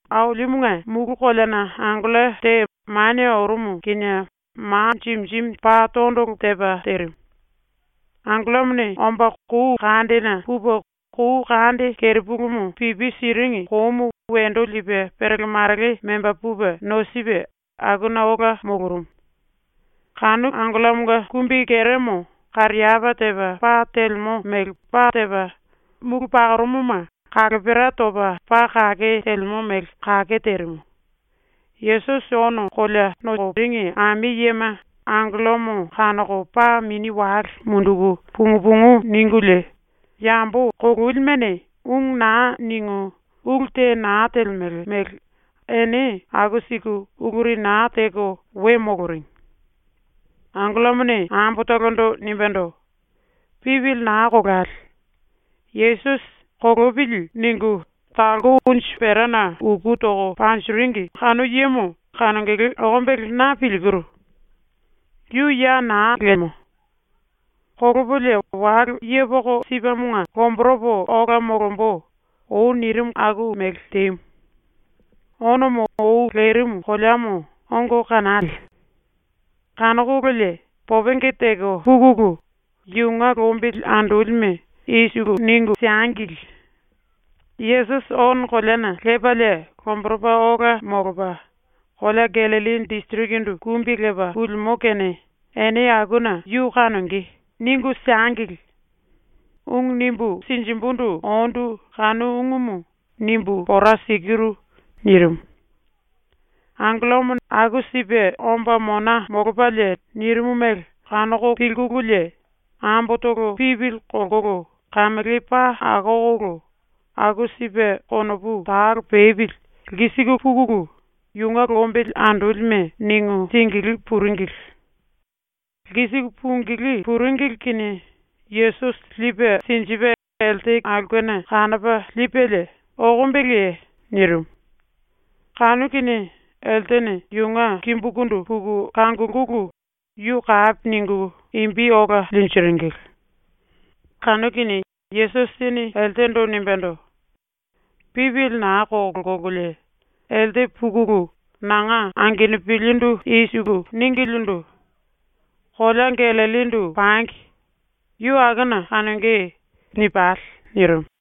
Ailimunge mulu koleana angello te manie orumu kinie ma jimi jimi paa tondolo tepa terimu. Angellomone omba kou kandena pupe kou kande kerepulumu pipi siringi koumu wendo lipe perele marele memba pupe nosipe akuna ola molorumu. Kanu angellomonga kumbikeremo kariapá tepa pa telemo mele pa tepa, mulu pakorumuma kalopera topa paa kake telemo mele kake terimu. Yesusi ono kolea nokoringi ami yema angellomo kanoko paa mini wale munduku pungu pungu ningulie yambo kololimene ungu na ningu ulu te na telemele mele ene aku siku uluri na teko we moloringi. Angellomone ambotolondo nimbendo: “Pipili na kolale. Yesusi ‘Kolopili.’ ningu talko unju perana uku toko panjiringi kanu yemo kanongele okombele na pilkiru. Yu ya na lemo. ⸤“Kolopolie wale yepoko sipemonga⸥ lomboropo ola molombo.” ou nirimu aku mele temu. Onomo ou lerimu koleamo ongo kanale. Kanokololie popenge teko pukulu yunge lombili andolime i siku ningu siengili: “Yesusi ono koleana lepalie lomboropa ola molopa kolea Gallilli disirikindu kumbi lepa pulimo kene ene akuna yu kanonge.” ningu siengili. ⸤Ungu nimbu sinjimbundu ondu⸥ kanu ungumu nimbu pora sikiru.” nirimu. ⸤Angellomo aku sipe omba mona molopalie nirimu mele⸥ kanoko pilkululie ambotolo pipili kolkolo kamele paa akokolo, aku sipe konopu talo pepili lkisiku pukulu yunge lombili andolime ningu singilí puringili. ⸤Lkisiku pungilí puringili kinie⸥ Yesusi lipe sinjipe elte aulkena kanopa lipelie “Okombeleye?” nirimu. Kanu kinie eltene yunge kimbukundu puku kangulkulu yu kapi ningu imbi ola linjiringili. Kanu kinie Yesusini eltendo nimbendo: “Pipili na kolkololie, elte pukulu nanga angenupilindu ningilindu: “Kolea Gallillindu pangi. Yu akuna kanonge.” nipale.” nirimu.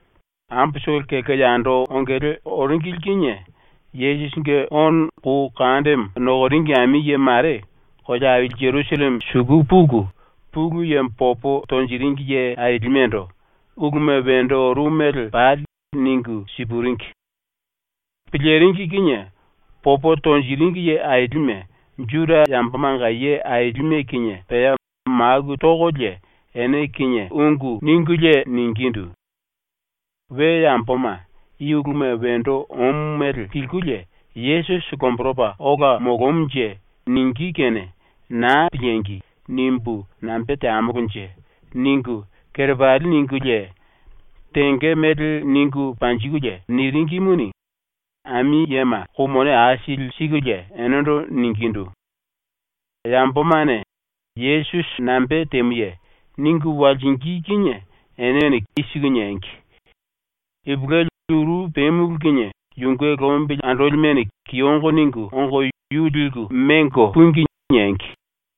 Ambotolo kelko yando ongele oringili kinie Yesusinge ono kou kandemo nokoringi ami ye mare kolea aili ⸤Jerusalleme⸥ suku puku Pulu Yemo popo tonjiringi ye ailimendo uluma wendo orumu mele pali ningu sipuringi. ⸤Piliringi kinie⸥ popo tonjiringi ye ailime, Juda yambomanga ye ailime kinie pea maku tokolie ene kinie ⸤ungu ningulie ningindu: “We yamboma i uluma wendo omu mele pilkulie “Yesusi lomboropa ola molomunje.” ningí kene ‘Naa piliengi!’ nimbu nambe teamolonje?” ningu⸥ kerepali ningulie tenge mele ningu panjikulie niringimuni, ami yema kou mone aisili sikulie enendo ningindu: “Yambomane “Yesusi nambe temuye?” ningu walsingí kinie enene i siku niengi: “Ipulueli uru pemulu kinie yunge lombili andolimene kiyongo ningu ongo yu liku mengo púngi.” niengi.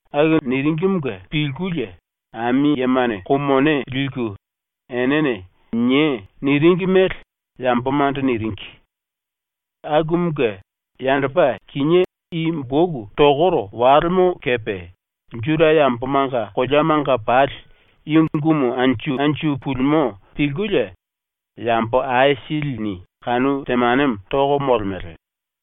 Aku niringimunge pilkulie ami yemane kou mone liku enene “Niei.” niringi mele yambomando niringi. Akumunge yandopa kinié i ⸤boku tokoro⸥ walemo kepe Juda yambomanga koleamanga pali i ungumu anju anju pulimo pilkulie yambo aisilini kanu temanemo toko molemele.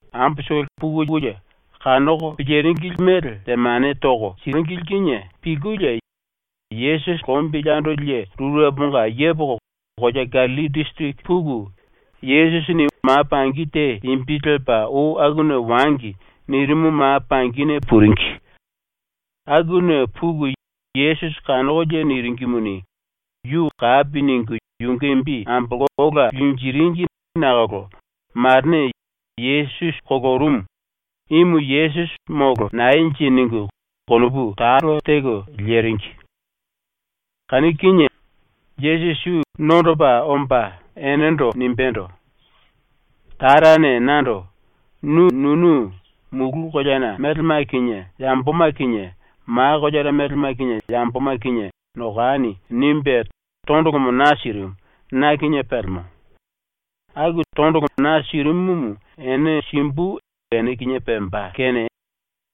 ⸤Amboma pukulie kanoko piliringi mele temane toko siringi⸥ kinie pilkulie Yesusi lombili andoli ye rureponga yepoko kolea Gallilli disiriki puku, Yesusini ma pangi te imbi lepa ou “Akuna wangi.” nirimu ma pangine puringi. Akuna puku Yesusi kanokolie niringimuni, yu kapi ningu yunge imbi ambolko ola linjiringi nakolo marene ‘Yesusi kolorumu. Imu Yesusi molo naenje?’ ningu konopu talo teko leringi. Kanu kinie Yesusi yu nondopa omba enendo nimbendo: “Tarane nando “Nu nunu mulu koleana melema kinie yamboma kinie, ma koleana melema kinie yamboma kinie nokani.” nimbe tondolomo na sirimu, na kinie pelemo. Aku ⸤tondolo na sirimumu ene simbu ene kinie pemba⸥ kene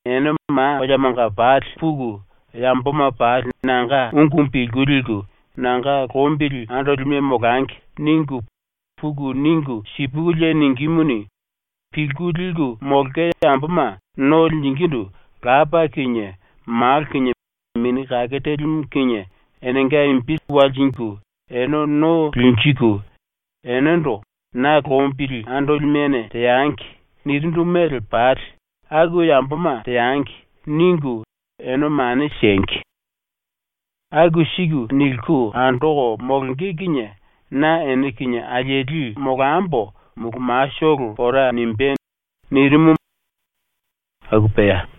ene ma koleamanga pali puku ‘Yamboma pali nanga ungumu pilku liku, nanga lombili andolime molangi.’ ningu, puku ningu sipukulie ningímuni, ⸤pilku liku molonge⸥ yamboma no linjingindu Lapa kinie Malo kinie Mini Kake Telimu kinie enenga imbi lelko ene no linjiku, enendo “Na lombili andolimene teangi.” nirindu mele pali ‘Aku yamboma teangi.’ ningu ene mane siengi. Aku siku niliku andoko molonge kinie na ene kinie alieli molambo mulu matolo pora nimbé.” nirimu. ⸤Aku pea.⸥